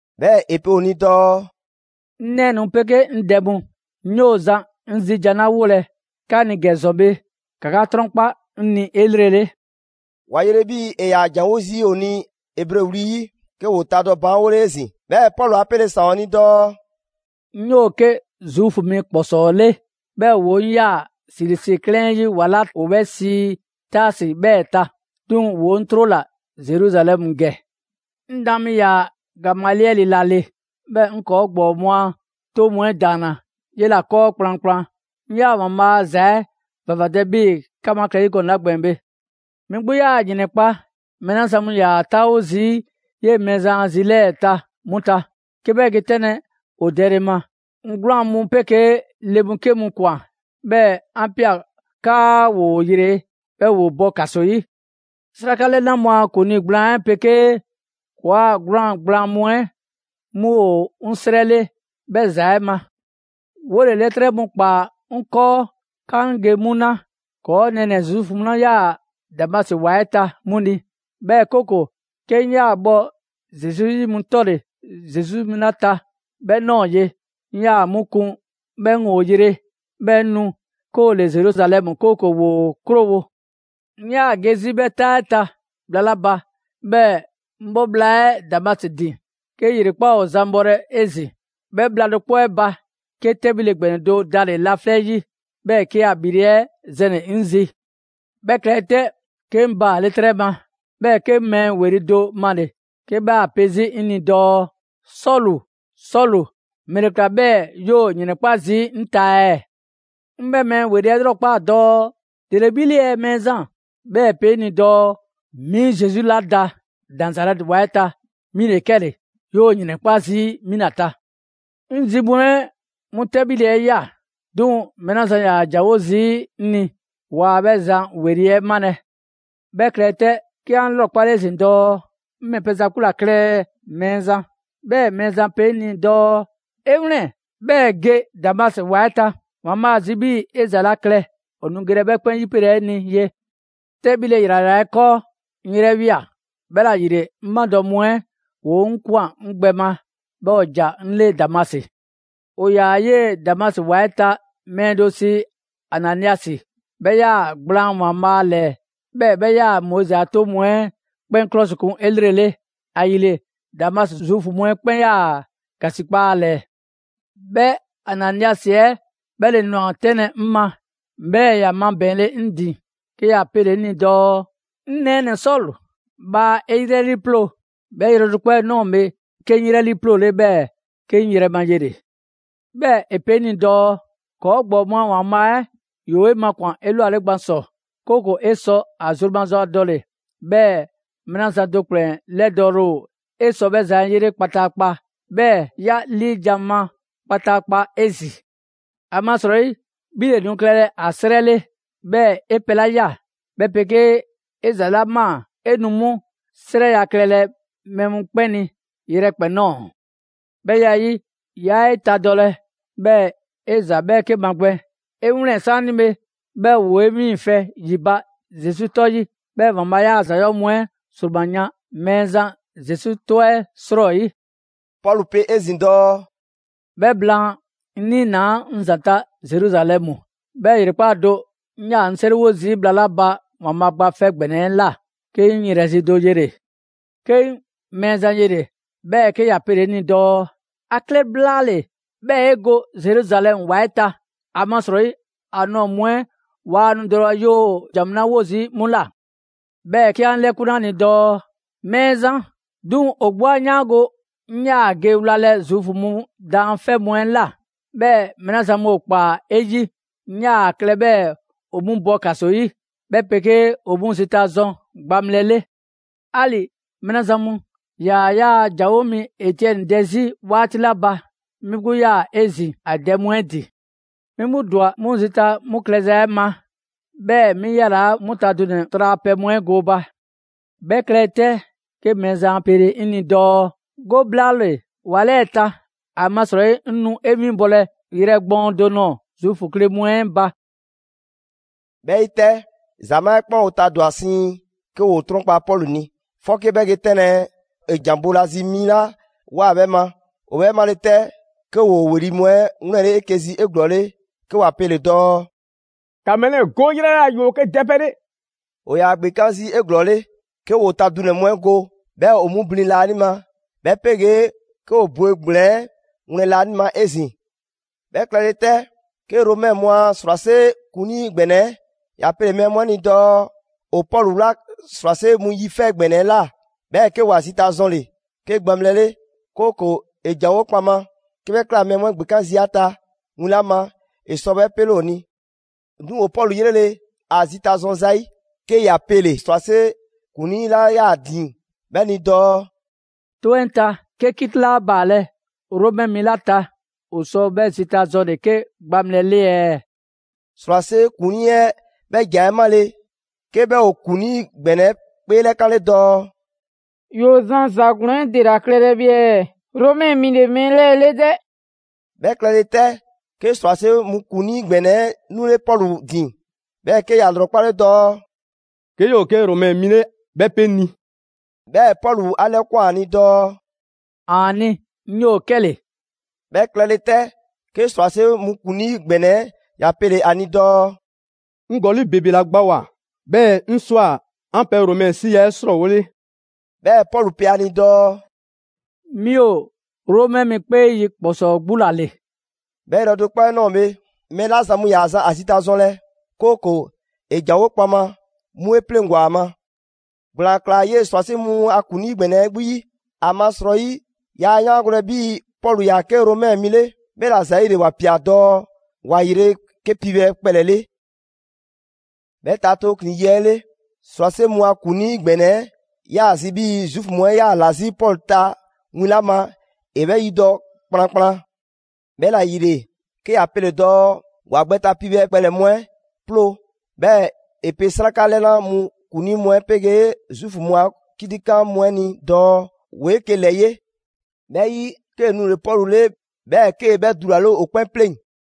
'Bhɛɛ‑ ‑e pe ‑o ni dɔɔ: «'Ŋ nɛɛnɛ‑ mu 'pegee 'ŋ dɛ mu, 'ŋ 'yoo‑ zan 'ŋ zi jan mu 'la 'wolɛ‑ 'ka ni ‑gɛ ‑zɔn bhe, ‑ka 'ka 'trɔnkpa 'ŋ ni 'elrele.» ‑Wa yele 'bhii‑ ‑e ‑yaa ‑janwo' zii' ‑o ni Ebre wli 'yi, 'ke ‑woo tadɔ baanwole 'ezin‑. 'Bhɛɛ‑ Pɔlu 'a 'pele ‑saan ‑o ni dɔɔ: «'Ŋ 'yoo‑ 'ke Zuufu mi ‑kpɔsɔɔ 'le, 'bhɛɛ‑ ‑woo' 'ŋ ꞊yaa Silisi 'klɛɛn 'ɛ 'yi ‑wa 'la ‑o 'bhɛ sii Taasi 'bhɛɛ‑ ta. 'Duŋ‑ ‑woo 'ŋ 'trola‑ Zeruzalɛmu ‑gɛ. 'Ŋ daan mi ‑yaa ‑Gamaliɛli ‑la ‑le, 'bhɛɛ 'ŋ ‑kɔɔ' ‑gbɔɔ mu a 'toŋ mu 'ɛ ‑daanna 'yela‑ 'kɔɔ kplankplan. 'Ŋ ꞊yaa ‑Waanbhaa' a ‑za 'ɛ ‑vavadɛ 'bhii‑ 'ka mu ‑a klɛ 'zi ‑zɔn gɔnɛ‑ 'la gbɛɛn‑ bhe. 'Mi 'gbu 'yaa‑ ‑yrɛnkpa' mɛɛ 'la zan mu ‑yaa 'taawo zii' 'yee‑ Mɛɛzan a zi 'lɛɛ‑ ta 'mu ta, 'ke 'bhɛ ge 'tɛnlɛ‑ ‑o dɛle ma. 'Ŋ 'gwlaan‑ mu 'pegee le 'ke mu ‑kwan 'bhɛɛ‑ 'an ꞊pia 'kaa ‑woo ‑yre, 'bhɛɛ‑ ‑woo bɔ ‑kaso 'yi. 'Sraka 'lɛna mu a ‑kuŋlii gblaan 'ɛ 'pegee ‑kɔɔ' 'a 'gwlaan‑ gblaan mu 'ɛ 'mu ‑o 'ŋ 'srɛ 'le 'bhɛ ‑za 'ɛ ma. 'Wole‑ 'lɛtrɛ mu ꞊kpaa 'ŋ 'kɔɔ 'kaa 'ŋ ge 'mu 'na ‑kɔɔ' nɛɛnɛ‑ Zuufu mu 'la ꞊yaa Damasi ‑wa 'ɛ ta 'mu ni. 'Bhɛɛ‑ 'kooko‑ 'ke 'ŋ ꞊yaa bhɔ Zesu 'yi mu 'tɔle‑ Zesu 'yi mu 'la ta 'bhɛ ꞊nɔɔ ye, 'ŋ ꞊yaa 'mu 'kun 'bhɛɛ‑ 'ŋ ‑o yre, 'bhɛɛ‑ 'ŋ nu 'ke ‑o ‑le Zeruzalɛmu, 'kooko‑ ‑woo 'krowo‑.» «'Ŋ 'yaa‑ ge 'zi 'bhɛ 'taa 'ɛ ta bhla 'la ba, 'bhɛɛ‑ 'ŋ 'bhɔ ꞊ bhla 'ɛ Damasi ‑din, 'ke ‑yrekpaa' ‑o zan bhɔlɛ 'ezin‑. 'Bhɛ bhla do 'kpɔ 'ɛ ba, 'ke 'tɛbhile ‑gbɛnɛ do dale‑ laflɛ' 'yi, 'bhɛɛ‑ 'ke ‑a ‑bhile' 'ɛ zɛnle‑ 'ŋ zi. 'Bhɛ klɛle 'tɛ, 'ke 'ŋ baale' 'trɛ ma, 'bhɛɛ‑ 'ke 'ŋ mɛɛ ‑weli' do male‑ 'ke 'bhɛ ‑a pe 'zi 'ŋ ni dɔɔ: ‹Sɔlu, Sɔlu, ‑mɛle ‑kla 'bhɛɛ‑ 'yoo‑ ‑yrɛnkpa' zii' 'ŋ ta ɛɛ?› 'Ŋ 'bhɛ mɛɛ ‑weli' 'ɛ 'lrɔkpaa‑ dɔɔ: ‹‑Dele 'bhi 'le ɛɛ Mɛɛzan?› 'Bhɛɛ‑ ‑e pe 'ŋ ni dɔɔ: ‹'Mi Zesu 'la da Nazarɛti ‑wa 'ɛ ta, mi ‑le 'kɛle‑, 'yoo‑ ‑yrɛnkpa' zii' 'mi ‑la ta.› 'Ŋ zi mu 'ɛ 'mu 'tɛbhile 'ɛ ꞊ya, 'duŋ‑ mɛɛ 'la zan ‑yaa ‑janwo' zii' 'ŋ ni waa 'bhɛ zan ‑weli' 'ɛ 'malɛ‑. 'Bhɛ klɛle 'tɛ, 'ke 'an 'lrɔkpale 'ezin‑ dɔɔ: ‹'Ŋ ‑mɛ pɛ za 'gbu ‑la klɛ ɛɛ Mɛɛzan?› 'Bhɛɛ‑ Mɛɛzan pe 'ŋ ni dɔɔ: ‹'E 'wlɛn‑, 'bhɛɛ‑ 'e ge Damasi ‑wa 'ɛ ta. ‑Waanbhaa' ‑a zi 'bhii‑ 'e ‑za 'la klɛ, ‑o nu gelɛ 'bhɛ 'kpɛn 'pelɛ‑ 'e ni ye.› 'Tɛbhile ‑yrayra 'ɛ 'kɔɔ, 'ŋ 'yrɛ ꞊wia. 'Bhɛla‑ ‑yile, 'ŋ 'madɔ‑ mu 'ɛ ‑woo 'ŋ ꞊kwan 'ŋ gbɛ ma, 'bhɛɛ‑ ‑o ‑ja 'ŋ 'le Damasi.» «‑O ‑yaa 'yee‑ Damasi ‑wa 'ɛ ta mɛɛ do sii Ananiasi, 'bhɛ ꞊yaa gblaan ‑Waanbhaa' ‑lɛɛ; 'bhɛɛ‑ 'bhɛ ꞊yaa Moizi a 'toŋ mu 'ɛ 'kpɛn 'klɔsikun 'elrele; ‑ayile Damasi Zuufu mu 'ɛ 'kpɛn ꞊yaa ‑gasikpa ‑a ‑lɛɛ. 'Bhɛ Ananiasi 'ɛ 'bhɛ ‑le ꞊nwa 'tɛnlɛ‑ 'ŋ ma, 'bhɛɛ‑ ‑ya mabɛɛnle 'ŋ ‑din, 'ke ‑ya pele‑ 'ŋ ni dɔɔ: ‹'Ŋ nɛɛnɛ‑ Sɔlu, bhaa 'e 'yrɛ 'liiploo‑!› 'Bhɛ yrɛ do 'kpɔ 'ɛ ꞊nɔɔ bhe, 'ke 'ŋ 'yrɛ 'liiploole 'bhɛɛ‑ 'ke 'ŋ yrɛ ma yele‑. 'Bhɛɛ‑ ‑e pe 'ŋ ni dɔɔ: ‹‑Kɔɔ' ‑gbɔɔ mu a ‑Waanbhaa' 'ɛ ‑yoo 'e makwan‑ 'elwale gban ‑sɔ, 'kooko‑ 'e sɔ ‑a zru maza dɔle‑, 'bhɛɛ‑ mɛɛ 'la zan do ‑kplɛn 'lɛdɔɔle ‑o 'e sɔ 'bhɛ zan 'ɛ 'yele kpataakpa, 'bhɛɛ‑ 'ya 'liijan‑ ma kpataakpa 'ezin‑. ‑Amasrɔyi 'bhi ‑le nu klɛlɛ ‑a 'srɛ 'le, 'bhɛɛ‑ 'e pɛ 'la ꞊ya, 'bhɛ 'pegee 'e ‑za 'la ꞊maa, 'e nu 'mu 'srɛya‑ klɛlɛ mɛɛ mu 'kpɛn ni yrɛkpɛn‑ ꞊nɔɔ. 'Bhɛ ya 'ɛ 'yi, 'yaa 'etadɔlɛ, 'bhɛɛ‑ 'e ‑za 'bhɛɛke magbɛn. 'E 'wlɛn‑ 'saanibhe, 'bhɛɛ‑ ‑woo 'e 'wiiŋfɛ‑ ‑yi ba Zesu 'tɔ 'yi, 'bhɛɛ‑ ‑Waanbhaa' 'yaa‑ ‑za 'yɔɔ‑ mu 'ɛ ma ‑sroma yan Mɛɛzan Zesu 'tɔ 'ɛ 'srɔyi.›» Pɔlu pe 'ezin‑ dɔɔ: «'Bhɛ blaan, 'ŋ 'niinaa‑ 'ŋ ‑zanta' Zeruzalɛmu. 'Bhɛɛ‑ ‑yrekpaa' do, 'ŋ 'yaa‑ 'ŋ 'seriwo zii' bhla 'la ba ‑Waanbhaa' Gba 'Fɛ ‑Gbɛnɛ 'ɛ ꞊la, 'ke 'ŋ 'yrɛ zi do yele‑. 'Ke 'ŋ Mɛɛzan yele‑, 'bhɛɛ‑ 'ke ‑ya pele‑ 'ŋ ni dɔɔ: ‹‑A klɛ blaale‑, 'bhɛɛ‑ 'e go Zeruzalɛmu ‑wa 'ɛ ta, ‑amasrɔyi ‑a nɔɔ‑ mu 'ɛ waa nu dɔlɛ 'yoo‑ 'an ‑jan mu 'la 'wo zii' 'mu ꞊la.› 'Bhɛɛ‑ 'ke 'an 'lɛkunle 'a ni dɔɔ: ‹Mɛɛzan, 'duŋ‑ ‑o 'gbu 'a 'yaango‑ 'ŋ ꞊yaa ge wlalɛ Zuufu mu daanfɛ' mu 'ɛ ꞊la. 'Bhɛɛ‑ mɛɛ 'la zan mu ‑o ‑kpaa 'e 'yi, 'ŋ ꞊yaa klɛ 'bhɛɛ‑ ‑o 'mu bɔ ‑kaso 'yi, 'bhɛ 'pegee ‑o 'mu zita zɔn gbaŋbhlɛ 'le. 'Ali‑ mɛɛ 'la zan mu ‑yaa 'yaa‑ ‑janwo' mi Etiɛni dɛ 'zi 'waati 'la ba, 'mi 'gbu 'yaa‑ 'ezin‑ ‑a dɛ mu 'ɛ ‑din. 'Mi 'gbu ‑dwa 'mu zita 'mu klɛza 'ɛ ma, 'bhɛɛ‑ 'mi 'yalaa 'mu ta dunɛ‑ tralapɛ mu 'ɛ gooba.› 'Bhɛ klɛle 'tɛ, 'ke Mɛɛzan 'a 'pele 'ŋ ni dɔɔ: ‹Go blaale‑ ‑wa 'lɛɛ‑ ta, ‑amasrɔyi 'ŋ nu 'e 'winbɔlɛ yrɛ gbɔɔn do nɔɔ‑ Zuufu kle mu 'ɛ ba.›» 'Bhɛ 'yi 'tɛ, ‑Zamaa' 'ɛ 'kpɛn ‑o tadwa‑ siiŋ, 'ke ‑woo 'trɔnkpa‑ Pɔlu ni, 'fɔke 'bhɛ ge 'tɛnlɛ‑ ‑e ‑jan boolazi mi 'la ꞊woa 'bhɛ ma. ‑O 'bhɛ 'male 'tɛ 'ke ‑woo ‑weli' mu 'ɛ 'wlɛnle 'eke‑ zi 'eglɔɔle, 'ke ‑wa pele‑ dɔɔ: «‑Ka mɛɛ 'lɛɛ‑ go 'o 'yrɛ ꞊la, ‑yoo 'ke dɛpɛ 'le!» ‑O ‑yaa ‑gbekan' zii' 'eglɔɔle, 'ke ‑woo ta dunɛ‑ mu 'ɛ go, 'bhɛɛ‑ ‑o 'mu blin laanima; 'bhɛ 'pegee 'ke ‑o bwe ‑gblɛn 'ɛ wlɛn laanima 'ezin‑. 'Bhɛ klɛle 'tɛ, 'ke Romɛ mu a ‑srwase' ‑kuŋlii ‑gbɛnɛ 'ɛ ‑ya pele‑ mɛɛ mu 'ɛ ni dɔɔ ‑o Pɔlu 'wla ‑srwase' mu yi 'fɛ ‑gbɛnɛ 'ɛ ꞊la, 'bhɛɛ‑ 'ke ‑wa zita zɔnle‑ 'ke gbaŋbhlɛ 'le; 'kooko‑ ‑e ‑janwo' kpaŋma. 'Ke 'bhɛ ꞊kla, mɛɛ mu 'ɛ ‑gbekan' zii' ‑a ta win 'la ma, ‑e sɔ 'bhɛ 'pele ‑o ni. 'Duŋ‑ ‑o Pɔlu 'yrele, ‑a zita zɔn zayi', 'ke ‑ya pele‑ ‑srwase' ‑kuŋlii 'la 'yaa‑ ‑din 'bhɛ ni dɔɔ: «'Toŋ 'ɛ ta, 'ke 'kiti 'laa baalɛ Romɛ mi 'la ta, ‑o sɔ 'bhɛ zita zɔnle‑ 'ke gbaŋbhlɛ 'le ɛɛ?» ‑Srwase' ‑kuŋlii 'ɛ 'bhɛ ‑jan 'ɛ 'male‑, 'ke 'bhɛ ‑o ‑kuŋlii ‑gbɛnɛ 'ɛ 'kpeelɛkanlɛ dɔɔ: «'Yoo‑ zan ‑za ‑glɔɔn 'ɛ ‑dela klɛlɛ bhe ɛɛ? Romɛ mi ‑le mɛɛ 'lɛɛ‑ 'le 'dɛ!» 'Bhɛ klɛle 'tɛ, 'ke ‑srwase' mu ‑kuŋlii ‑gbɛnɛ 'ɛ 'nule Pɔlu ‑din, 'bhɛɛ‑ 'ke ‑ya ‑lrɔkpale dɔɔ: «'Ke 'yoo‑ 'ke Romɛ mi 'le, 'bhɛ 'pe 'ŋ ni.» 'Bhɛɛ‑ Pɔlu 'a 'lɛkwan‑ ‑a ni dɔɔ: «‑Aani', 'ŋ 'yoo 'kɛle‑.» 'Bhɛ klɛle 'tɛ, 'ke ‑srwase' mu ‑kuŋlii ‑gbɛnɛ 'ɛ ‑ya pele‑ ‑a ni dɔɔ: «'Ŋ ‑gɔli' ‑bebe ‑la gbawoa‑ 'bhɛɛ‑ 'ŋ ꞊swa 'an pɛ Romɛ 'siya‑ 'ɛ 'srɔɔwole.» 'Bhɛɛ‑ Pɔlu pe ‑a ni dɔɔ: «'Mi ‑o Romɛ mi 'kpee yi ‑kpɔsɔɔ 'gbu ‑la ‑le.» 'Bhɛ yrɛ do 'kpɔ 'ɛ ꞊nɔɔ bhe, mɛɛ 'la zan mu ‑yaa zan ‑a zita zɔnlɛ, 'kooko‑ ‑e ‑janwo' kpaŋma, 'mu 'e 'pleŋgwa‑ ‑a ma; ‑gblaan ꞊klaa 'yee‑ ‑srwase' mu a ‑kuŋlii ‑gbɛnɛ 'ɛ 'gbu 'yi, ‑amasrɔyi yaa 'yaangolɛ 'bhii‑ Pɔlu ‑yaa 'ke Romɛ mi 'le, 'bhɛla‑ ‑zɛɛle ‑ya ꞊pia dɔɔ ‑wa yre 'ke piibhɛ kpɛlɛ‑ 'le. 'Bhɛ ta tooklin‑ yi 'ɛ 'le, ‑srwase' mu a ‑kuŋlii ‑gbɛnɛ 'ɛ 'yaa‑ zi 'bhii‑ Zuufu mu 'ɛ 'yaa‑ ‑la 'zi Pɔlu ta win 'la ma ‑e 'bhɛ 'yidɔ‑ kplankplan; 'bhɛla‑ ‑yile, 'ke ‑ya pele‑ dɔɔ ‑wa gbɛ ta piibhɛ kpɛlɛ‑ mu 'ɛ 'ploo. 'Bhɛɛ‑ ‑e pe 'sraka 'lɛna‑ mu ‑kuŋlii mu 'ɛ 'pegee Zuufu mu a 'kitikan mu 'ɛ ni dɔɔ ‑woo 'eke‑ ‑lɛ 'ye. 'Bhɛ 'yi, 'kee‑ nule‑ Pɔlu 'le 'bhɛɛ‑ 'ke 'bhɛ dulale ‑o 'kpɛn 'pleŋ‑.